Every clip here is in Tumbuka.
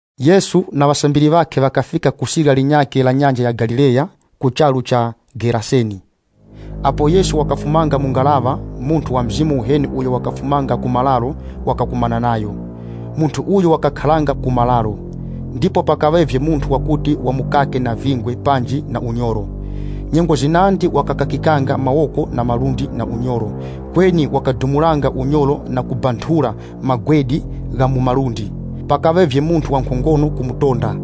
Yesu na ŵasambiri ŵakhe ŵakafika ku sirya linyakhe la Nyanja ya Galileya, ku charu cha Geraseni. Apo Yesu wakafumanga mu ngaraŵa, munthu wa mizimu yiheni uyo wakufumanga ku mararo wakakumana nayo. Munthu uyu wakakharanga ku mararo, ndipo pakaŵavye munthu wakuti wamukake na vingwe panji na unyoro. Nyengo zinandi wakakakikanga mawoko na malundi na unyoro, kweni wakadumulanga unyoro na kubanthura magwede gha mu malundi. Pakaŵavye munthu wa nkhongono kumutonda.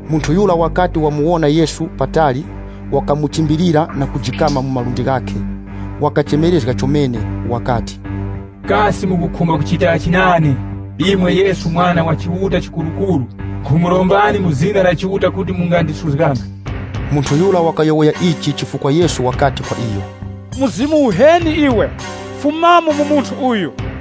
Munthu yura wakati wamuwona Yesu patali, wakamuchimbilira na kujikama mu malundi ghakhe. Wakachemerezga chomene wakati, “Kasi mukukhumba kuchitachi nane, imwe Yesu Mwana wa Chiuta Chikurukuru? Nkhumurombani mu zina la Chiuta kuti mungandisuzganga.” (Munthu yura wakayowoya ichi chifukwa Yesu wakati kwa iyo, “Mzimu uheni iwe, fumamo mu munthu uyu!”)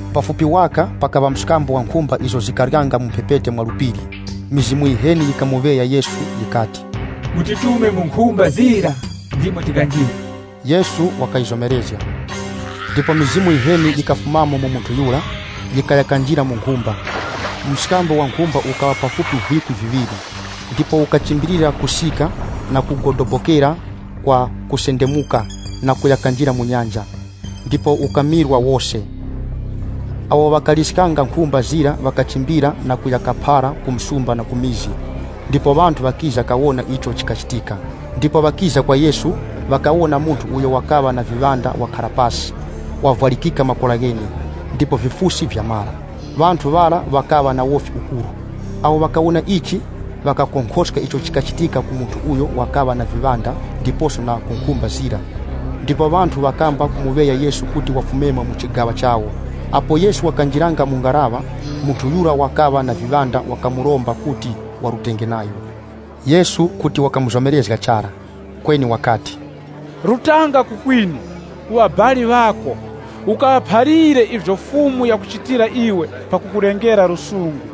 Pafupi waka, pakaŵa mskambo wa nkhumba izo zikaryanga mu mphepete mwa phiri. Mizimu yiheni yikamuŵeya Yesu yikati, “Mutitume mu nkhumba zira ndimo tikanjire.” Yesu wakayizomerezga. Ndipo mizimu yiheni yikafumamo mu munthu yura, yikaya kanjira mu nkhumba. Mskambo wa nkhumba ukaŵa pafupi vikwi viŵiri, ndipo ukachimbilira kusika na kugodobokera kwa kusendemuka na kuya kanjira mu nyanja, ndipo ukamirwa wose. Awo ŵakaliskanga nkhumba zira ŵakachimbira na kuya kaphara ku msumba na ku mizi, ndipo ŵanthu ŵakiza kawona icho chikachitika. Ndipo wakiza kwa Yesu, ŵakawona munthu uyo wakaŵa na mizimu yiheni wakhara pasi, wavwarikika makora ghene, ndipo vifusi vyamara. Ŵanthu ŵara ŵakaŵa na wofi ukuru. Awo ŵakawona ichi, ŵakakonkhoska icho chikachitika ku munthu uyo wakaŵa na viŵanda ndiposo na ku nkhumba zira. Ndipo ŵanthu ŵakamba kumuŵeya Yesu kuti wafumemo mu chigaŵa chawo. Apo Yesu wakanjiranga mu ngaraŵa, munthu mweneuyo wakaŵa na viŵanda wakamuromba kuti warutenge nayo. Yesu kuti wakamuzomerezga chara, kweni wakati, “Rutanga ku kwinu, ku ŵabali ŵako, ukaŵaphalire ivyo Fumu yakuchitira iwe pakukulengera lusungu.”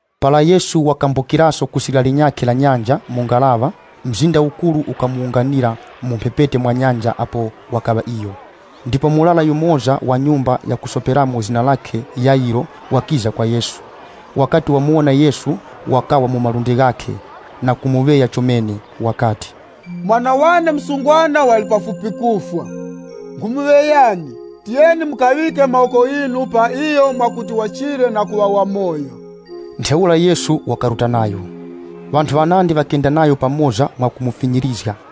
Para Yesu wakambukiraso ku sirya linyakhe la nyanja mu ngaraŵa, mzinda ukuru ukamuwunganira mu mphepete mwa nyanja apo wakaŵa iyo. Ndipo murara yumoza wa nyumba ya kusoperamo zina lakhe Yayiro wakiza kwa Yesu. Wakati wamuwona Yesu, wakawa mu malundi ghakhe, na kumuŵeya chomene wakati, “Mwana wane msungwana wali pafupi kufwa. Nkhumuŵeyani, tiyeni mukaŵike mawoko ghinu pa iyo, mwakuti wachire na kuŵa wamoyo.” Ntheura Yesu wakaruta nayo. Ŵanthu ŵanandi ŵakenda nayo pamoza mwa kumufinyirizga.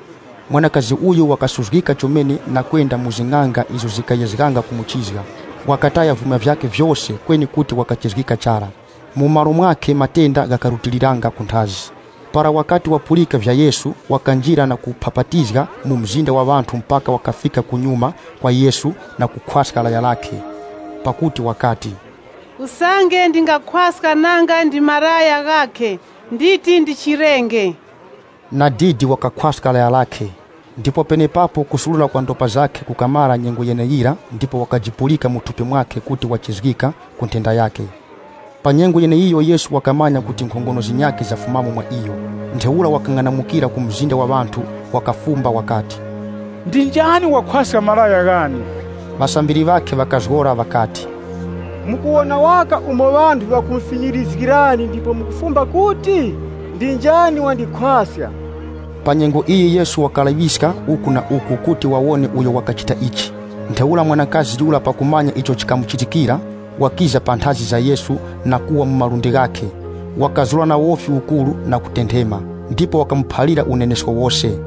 Mwanakazi uyu wakasuzgika chomene na kwenda mu zing'anga izo zikayezganga kumuchizga. Wakataya vyuma vyakhe vyose kweni kuti wakachizgika chara. Mu malo mwakhe matenda ghakarutiliranga kunthazi. Para wakati wapulika vya Yesu, wakanjira na kuphapatizga mu mzinda wa ŵanthu mphaka wakafika kunyuma kwa Yesu na kukhwaska laya lakhe. Pakuti wakati, “Usange ndingakhwaska nanga ndi malaya ghakhe, nditi ndichirenge.” Nadidi wakakhwaska laya lakhe, ndipo penepapo kusurura kwa ndopa zakhe kukamara nyengo yeneyira ndipo wakajipulika mu thupi mwakhe kuti wachizgika ku nthenda yakhe. Pa nyengo yeneiyo Yesu wakamanya kuti nkhongono zinyakhe zafumamo mwa iyo. Ntheura wakang'anamukira ku mzinda wa ŵanthu wakafumba wakati, “Ndi njani wakhwaska malaya ghane?” Ŵasambiri ŵakhe ŵakazgora ŵakati, “Namwe mukuwona waka kuti ŵanthu ŵakumufinyirizgani, kweni mukufumba kuti, ‘Ndi njani wandikhwaska?’” Pa nyengo iyi Yesu wakalaŵiska uku na uku kuti wawone uyo wakachita ichi. Ntheura mwanakazi yura pakumanya icho chikamuchitikira, wakiza panthazi za Yesu na kuwa mu malundi ghakhe. Wakazura na wofi ukuru na kutenthema, ndipo wakamuphalira unenesko wose.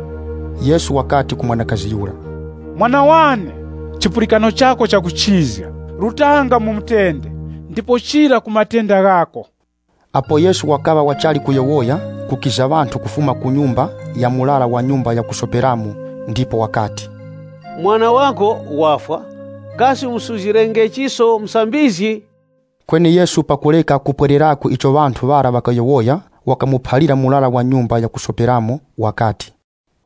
Yesu wakati ku mwanakazi yura, “Mwana wane, chipulikano chako chakuchizga. Rutanga mu mutende, ndipo chira ku matenda ghako.” Apo Yesu wakaŵa wachali kuyowoya, kukiza ŵanthu kufuma ku nyumba ya murara wa nyumba ya kusoperamo ndipo ŵakati, “Mwana wako wafwa. Kasi ukumusuzgirachiso Musambizgi?” Kweni Yesu pakureka kupwererako icho ŵanthu ŵara ŵakayowoya, wakamuphalira murara wa nyumba ya kusoperamo wakati,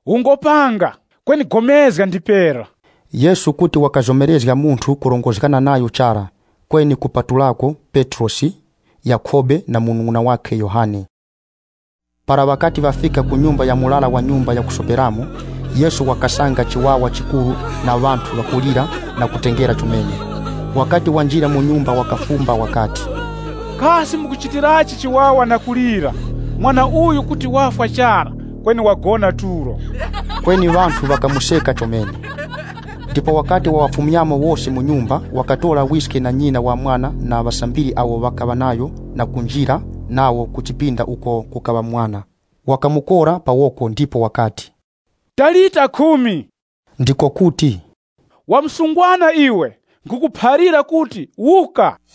“Ungopanga, kweni upulikane ndipera.” Yesu kuti wakazomerezga munthu kurongozgana nayo chara, kweni kupatulako Petrosi Yakhobe na munung'una wakhe Yohane. Para ŵakati ŵafika ku nyumba ya murara wa nyumba ya kusoperamo, Yesu wakasanga chiwawa chikuru na ŵanthu ŵakulira na kutengera chomene. Wakati wanjira mu nyumba wakafumba wakati, “Kasi mukuchitirachi chiwawa na kulira? Mwana uyu kuti wafwa chara kweni wagona tulo.” Kweni ŵanthu ŵakamuseka chomene. Ndipo wakati waŵafumyamo wose mu nyumba, wakatora wiske na nyina wa mwana na ŵasambiri awo ŵakaŵa nayo na kunjira nawo ku chipinda uko kukaŵa mwana. Wakamukora pa woko ndipo wakati, “Talita, Kumi,” ndiko kuti, “Wa msungwana iwe, nkhukuphalira kuti wuka.”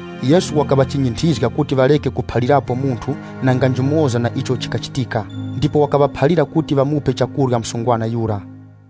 Yesu wakaŵachinyinthizga kuti ŵareke kuphalirapo munthu nanga njumoza na icho chikachitika. Ndipo wakaŵaphalira kuti ŵamupe chakurya msungwana yura.